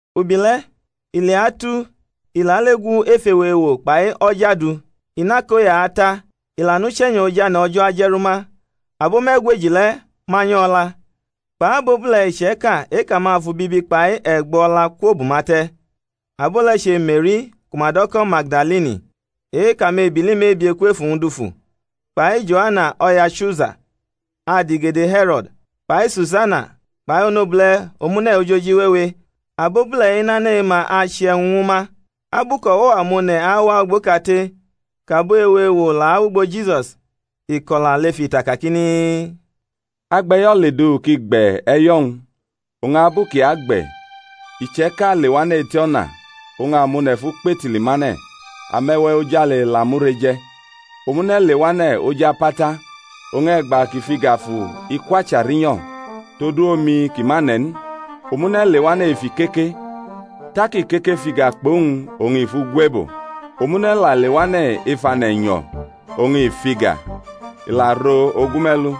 Ubile̩ i leatu i lale gu ef ewo ewo kpai o̩ja du; i nʼakoya ata, i la nʼuche̩nyo̩ ojane̩ O̩jo̩ aje̩ rʼuma; abo me̩gweji le̩ manyʼo̩ o̩la, kpʼabobule̩ iche̩ka e-kʼamafu bibi kpai e̩gbo o̩la kwobʼuma te̩; abo le̩ che Me̩ri, ku ma do̩ ko̩ Magdalini, e-kʼamebili mebie kwʼef uwñ dufu, kpai Joana o̩ya Chusa, adigede He̩ro̩d, kpai Susana kpai abobule̩ omune̩ ojoji wewe. Abobule̩-i nʼane̩ e-ma ache e̩wñ ñwu ma. Abu kʼo̩wo̩-amone̩ awa ugbo kate, kʼabo ewo ewo la awʼugbo Jisus, i ko̩la lef ita kakini, Agbe̩yo̩ ledufu kʼi gbe̩ e̩yo̩-wñ; oñ abu kʼi agbe̩, iche̩ka lewane̩ eti o̩na; oñ amone̩ fʼu kpetili mane̩, ame̩we̩ ojale la mure je̩. Omune̩ lewane̩ oj apata; oñ e̩gba kʼi fʼiga fu i kwacha rinyo̩ todu omi kʼi ma ne̩ n. Omune̩ lewane̩ ef ikeke; tak ikeke fʼiga kpʼowñ oñ i fʼu gwebo. Omune̩ la lewane̩ ef ane̩ e̩nyo̩, oñ i fʼiga, i la ro̩ ogume̩lu.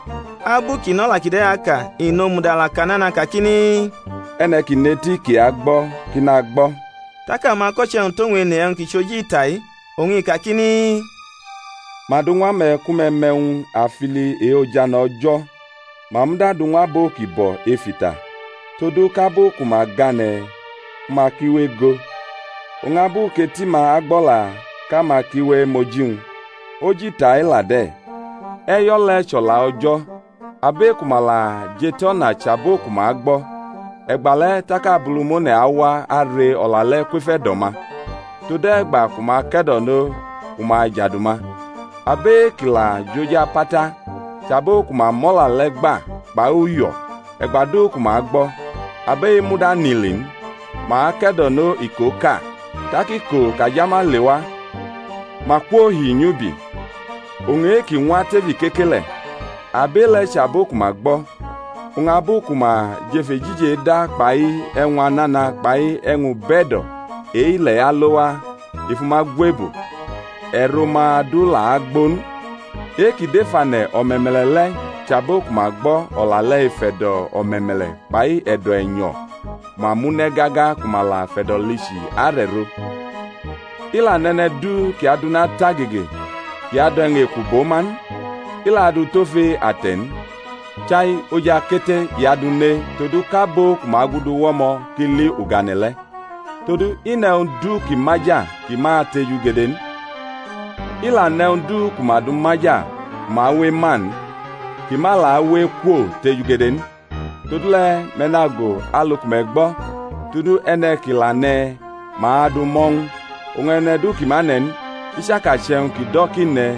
Abu kʼi nʼo̩la kide̩ aka, i nomudala ka nana kakini, E̩ne̩ ki nʼeti ki agbo̩, ki nagbo̩. Tak amako̩che̩-wñ tʼowñ ene e̩wñ ki chʼoji ita-i. Oñ i kakini, Ma du ñw ame̩ ku me̩ mʼe̩wñ afili e-ojane̩ O̩jo̩; ma muda du ñw abo ki bo̩ ef ita; todu kʼabu ku ma gane̩ ma ki we ego, oñ abu kʼeti-ma agbʼo̩la kʼama ki we maʼoji-wñ. Oji ita-i la de̩. E̩yo̩ le̩ chʼO̩la O̩jo̩. Abʼe-ku ma la jʼetʼo̩na chʼabo ku ma gbo̩; e̩gbale̩ tak Abulumone̩ awa are o̩la le̩ kwef e̩do̩-ma, tode̩gba ku ma ke̩do̩no ku ma ajadu ma. Abʼe-ki la jʼoji apata chʼabo ku ma mʼo̩la le̩ gba kpai uyo̩ e̩gba du ku ma gbo̩; abʼe-i muda nʼili n, ma ake̩do̩no ikoʼka, tak iko kʼajama lewa ma kwohi nyʼubi. Oñ e-ki ñwa tef ikeke le̩, abʼe-le̩ chʼabo ku ma gbo̩, oñ abu ku ma jʼef ejiji eda kpai e̩wñ anana kpai e̩wñ-ube̩do̩ ile̩-i alo waa i fu ma gwebo, e̩ro-ma du la agbo n. E-ki dʼef ane̩ o̩me̩me̩le̩ le̩ chʼabo ku ma gbo̩ o̩la le̩ ef e̩do̩ o̩me̩me̩le̩ kpai e̩do̩ e̩nyo̩ ku ma mʼu ne̩ gaga ku ma la fe̩do̩lichi are̩ro. I la nʼe̩ne̩ du kʼi adʼuna tʼagege kʼi adu e̩wñ eku bʼo ma n, i la adʼu tʼofe ate̩ n; chai oj akete i adʼu ne todu kʼabo ku ma agudu wʼo̩mo̩ ki li ugane̩ le̩. Todu i nʼe̩wñ du ki maja ki ma atejugede n. I la nʼe̩wñ du ku ma du maja ku ma awe ema n kʼi ma la awe ekwotejugede n. Todule̩ me̩ nago alu ku me̩ gbo̩; todu e̩ne̩ kʼi la ne̩, ma adʼu mʼo̩ ñw u; oñ e̩ne̩ du ki ma ne̩ n, i chaka chʼe̩wñ kʼi do̩ kʼi ne̩,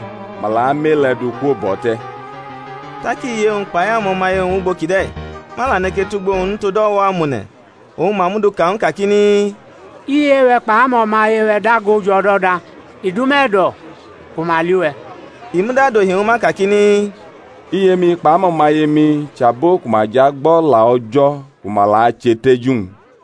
ma la amʼe-le̩ du kwobʼo̩ te̩. Tak iye-wñ kpai amo̩maye-wñ wʼugbo kʼi de̩, ma la neke tʼugbo-wñ n tod o̩wo̩-amone̩. Oñ ma mʼu du ka ñw u kakini, Iye-we̩ kpai amo̩maye-we̩ dago jʼo̩do̩da, i dʼuma e̩do̩ ku ma li uwe̩. I muda dohi ñwu ma kakini, Iye-mi kpʼamo̩maye-mi chʼabo ku ma jʼagbo̩ O̩la O̩jo̩ ku ma la ache teju-wñ.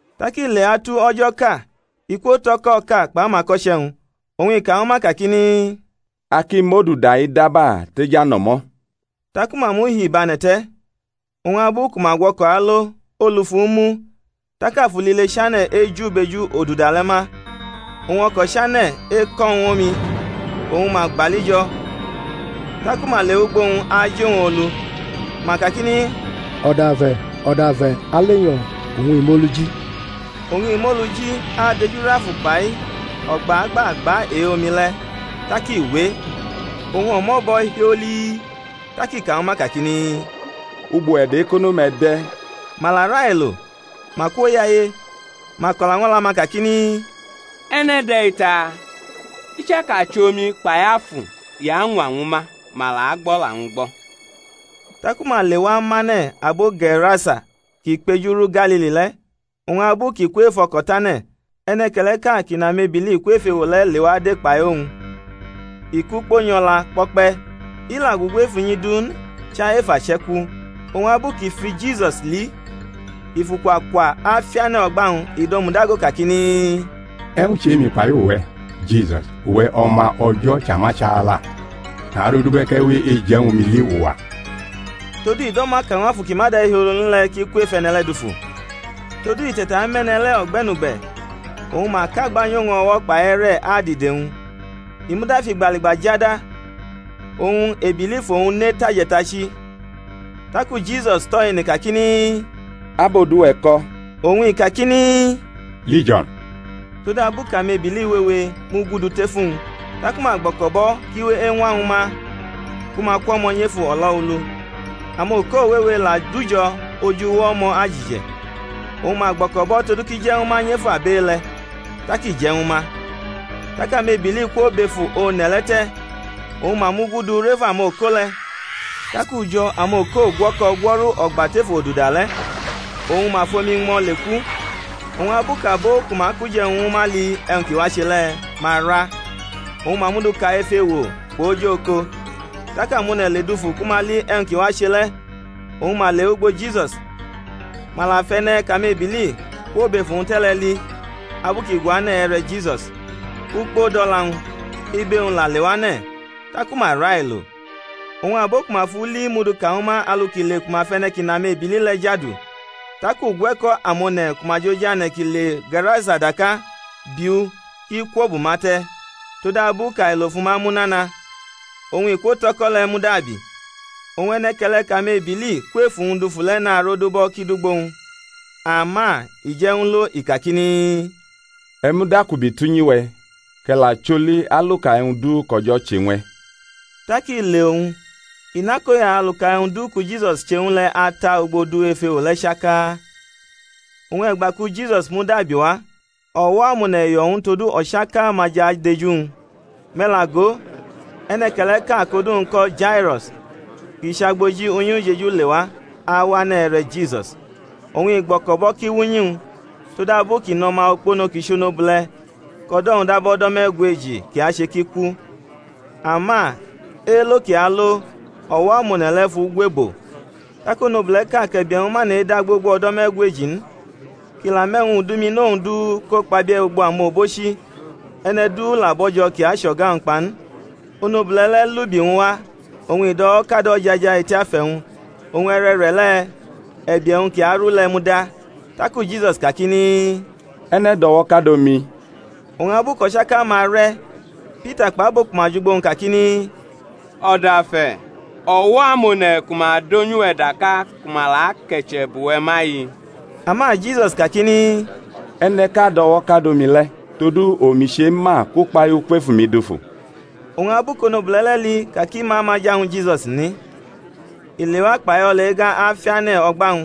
Tak i leatu o̩jo̩ʼka i kwotʼo̩ko̩ʼka kpʼamako̩che̩-wñ, oñ i ka ñwu ma kakini, A ki mʼoduda-i daba tʼejʼano̩mo̩, taku ma muhibʼane̩ te̩. Oñ abu ku ma gwʼo̩ko̩ alo, olu fʼu mu; tak afu lile chane̩ eju bʼeju oduda le̩ ma, oñ o̩ko̩ la chane̩ eko̩ ñw omi, oñ ma gbali jo̩. Taku ma lewʼugbo-wñ aji owñ olu, ma kakini O̩dafe̩, O̩dafe̩, a alenyo̩! Oñ i mʼolu ji, adejurʼafu kpai o̩gba-gba-gba e-omi le̩; tak i we, oñ o̩mo̩ bo̩ hiolii. Tak i ka ñwu ma kakini, Ugbo e̩do̩-ekono-me̩ de̩? Ma la railo, ma kwoyaye, ma ko̩la ñw o̩la-ma kakini, E̩ne̩ de̩-i taa? I chaka chʼomi kpai afu, i añwa ñwu ma, ma la gbʼo̩la-wñ gbo̩? Taku ma lewa mʼane̩ abo Ge̩rasa ki kpejuru Galili le̩. Oñ abu kʼi kwʼef o̩ko̩ tʼane̩, e̩ne̩ke̩le̩ʼka kʼi nʼame-bili kwʼef ewo le̩ lewa de kpai owñ; i kʼukpo nyʼo̩la kpo̩kpe̩, i la gugu ef unyi du n chai ef ache̩ku. Oñ abu kʼi fu Jisus li, i fʼukwa kwa afiane̩ o̩gba-wñ, i domudago kakini, E̩wñ chʼe-mi kpai uwe̩, Jisus, uwe̩ O̩ma O̩jo̩ Chamachala? narodubʼe̩ kʼe̩ we eje̩ ñwu mi li uwa. Todu i do̩mo̩ aka ñw afu ki ma de̩hiolo n le̩ kʼi kwʼef e̩ne̩ le̩ dufu. Todu i te̩tamʼe̩ne̩ le̩ o̩gbe̩nugbe̩ oñ ma kʼagba nyʼowñ o̩wo̩ kpai e̩re̩ adidewñ; i muda fʼigbaligba jada, oñ ebili fʼowñ ne tʼaje̩tachi. Taku Jisus tʼo̩ ene kakini, Ab odu-we̩ ko̩? Oñ i kakini, Lijio̩n; todabu kʼamebili wewe mugudu tef uwñ. Taku ma gbo̩ko̩bʼo̩ kʼi we eñwañwu ma ku ma kwʼo̩mo̩ nyʼef o̩lo̩ulu. Amoko wewe la dujo̩ oj uwo o̩mo̩ ajije̩; oñ ma gbo̩ko̩bʼo̩ todu kʼi je̩ ñwu ma nyʼef abʼe-le̩. Tak i je̩ ñwu ma. Tak amebili kwobʼef one̩ le̩ te̩ oñ ma mugudu rʼef amoko le̩; tak ujo̩ amoko gwo̩ko̩ gwo̩ru o̩gba tef oduda le̩, oñ ma fʼomi ñmo̩ leku. Oñ abu kʼabo ku ma kʼuje̩wñ ñwu ma li e̩wñ ki wache le̩, ma ra, oñ ma mʼu du ka ef ewo kpʼoj oko. Taku amone̩ ledufu ku ma li e̩wñ ki wache le̩, oñ ma lewʼugbo Jisus, ma la fʼe̩ne̩ kʼamebili kwobʼef uwñ te̩ le̩ li abu kʼi guane̩ e̩re̩ Jisus, ukpo dʼo̩la-wñ, ibe-wñ la lewane̩; taku ma railo. Oñ abo ku ma fʼu li mʼu du ka ñwu ma alu ki le ku ma fʼe̩ne̩ kʼi nʼamebili le̩ jadu. Tak ugwe̩ko̩ amone̩ ku ma jʼojane̩ ki le Ge̩rasa daka bi u kʼi kwobʼuma te̩; todabu kʼailo fu ma mu nana; oñ i kwotʼo̩ko̩ le̩ mudabi. Oñ e̩ne̩ke̩le̩ kʼamebili kwʼef uwñ dufu le̩ narodubʼo̩ kʼi dʼugbo-wñ; ama i je̩ ñw u lo, i kakini, E̩ mudakubi tʼunyi-we̩, kʼe̩ la choli aluka e̩wñ du kʼO̩jo̩ che ñw e̩. Tak i le owñ, i nʼakoya aluka e̩wñ du ku Jisus che ñw u le̩ ata ugbo du ef ewo le̩ chaka. Oñ e̩gba ku Jisus mudabi wa, o̩wo̩-amone̩ yo̩ ñw u todu o̩chaka-ma jʼadeju-wñ. Me̩ la go, e̩ne̩ke̩le̩ʼka kʼodu-wñ ko̩ Jairo̩s kʼi chʼagboji unyi-ujeju lewa, awane̩ e̩re̩ Jisus, oñ i gbo̩ko̩bʼo̩ kʼi wʼunyi-wñ; todabu kʼi nʼo̩ma okpono kʼi chʼonobule̩, kʼo̩do̩-wñ dab o̩do̩ me̩gweji, kʼi ache kʼi ku. Ama elo̩ kʼi alo, o̩wo̩-amone̩ le̩ fʼu gwebo. Tak onobule̩ʼka kʼe̩bie̩-wñ ma nʼeda gbogbo o̩do̩ me̩gweji n, kʼi la mʼe̩wñ udiñmino-wñ du ko kpabie̩ ugbo amobochi, e̩ne̩ du la bo̩jo̩ kʼi ache o̩ga-wñ kpa n, onobule̩ le̩ lʼubi-wñ wa oñ i dʼo̩wo̩kadʼojaja eti afe̩-wñ; oñ e̩re̩re̩le̩ e̩bie̩-wñ ki aru le̩ muda. Taku Jisus kakini, E̩ne̩ dʼo̩wo̩kado mi? Oñ abu kʼo̩chaka-ma re̩, Pita kpʼabo ku ma jʼugbo-wñ kakini, O̩dafe̩, o̩wo̩-amone̩ ku ma donyʼuwe̩ daka ku ma la ake̩che̩ bʼuwe̩ ma-i! Ama Jisus kakini, E̩ne̩ʼka do̩wo̩kado mi le̩; todu omi chema kʼukpahiu kwʼef umi dufu. Oñ abu kʼonobule̩ le̩ li ka kʼi ma maja ñwu Jisusi n, i lewa kpai o̩la-ega afiane̩ o̩gba-wñ,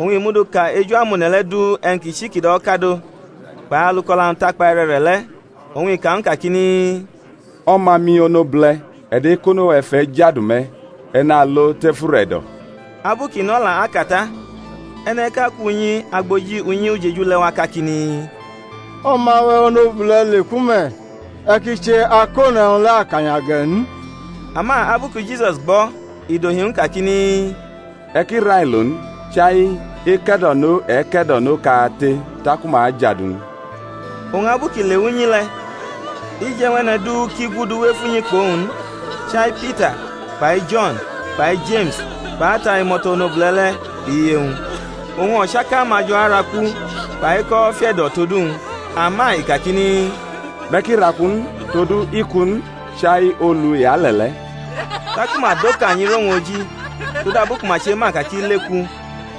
oñ i mudu ka eju amone̩ le̩ du e̩wñ ki chi kʼi do̩wo̩kadʼo, kpai alu kʼo̩la-wñ takpa e̩re̩re̩le̩. Oñ i ka ñw u kakini, O̩ma-mi onobule̩, e̩do̩-ekono-we̩ fʼe̩ jadu me̩; e̩ nalo tef ure̩do̩. Abu kʼi nʼo̩la aka ta, e̩ne̩ʼka kwʼunyi agboji unyi-ujeju le̩ wa kakini, O̩ma-we̩ onobule̩ leku me̩; e̩ ki che Akone̩wñ le̩ akanya ge̩ n. Ama abu ku Jisus gbʼo̩, i dohi ñw u kakini, E̩ ki railo n; chai eke̩do̩no e ke̩do̩no kate taku ma ajadu-wñ. Oñ abu kʼi lewa unyi le̩ i je̩ ñw e̩ne̩ du ki guduwʼef unyi kpʼowñ n, chai Pita kpai Jo̩n kpai Jeme̩s kpʼata imo̩to̩ onobule̩ le̩ kpʼiye-wñ. Oñ o̩chaka-ma jo̩ araku, kpai ekʼo̩wo̩ fiʼe̩do̩ tod uwñ; ama i kakini, Me̩ ki raku n, todu i ku n, chai olu i ale̩ le̩. Taku ma dokanyi rʼowñ oji, todabu ku ma chema ka kʼi leku.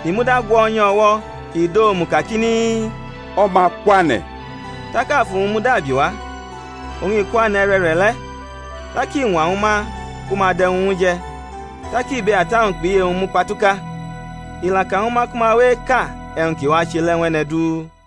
I muda gwo̩nyʼu o̩wo̩, i dʼomu kakini, O̩ma kwane̩! Tak afu-wñ mudabiwa, oñ i kwane̩ e̩re̩re̩le̩; tak i ñwañwu ma ku ma dʼe̩wñ ñw u je̩. Tak ibe ata-wñ kpʼiye-wñ mukpatuka; i la ka ñwu ma ku ma we eka e̩wñ ki wache le̩ ñw e̩ne̩ du.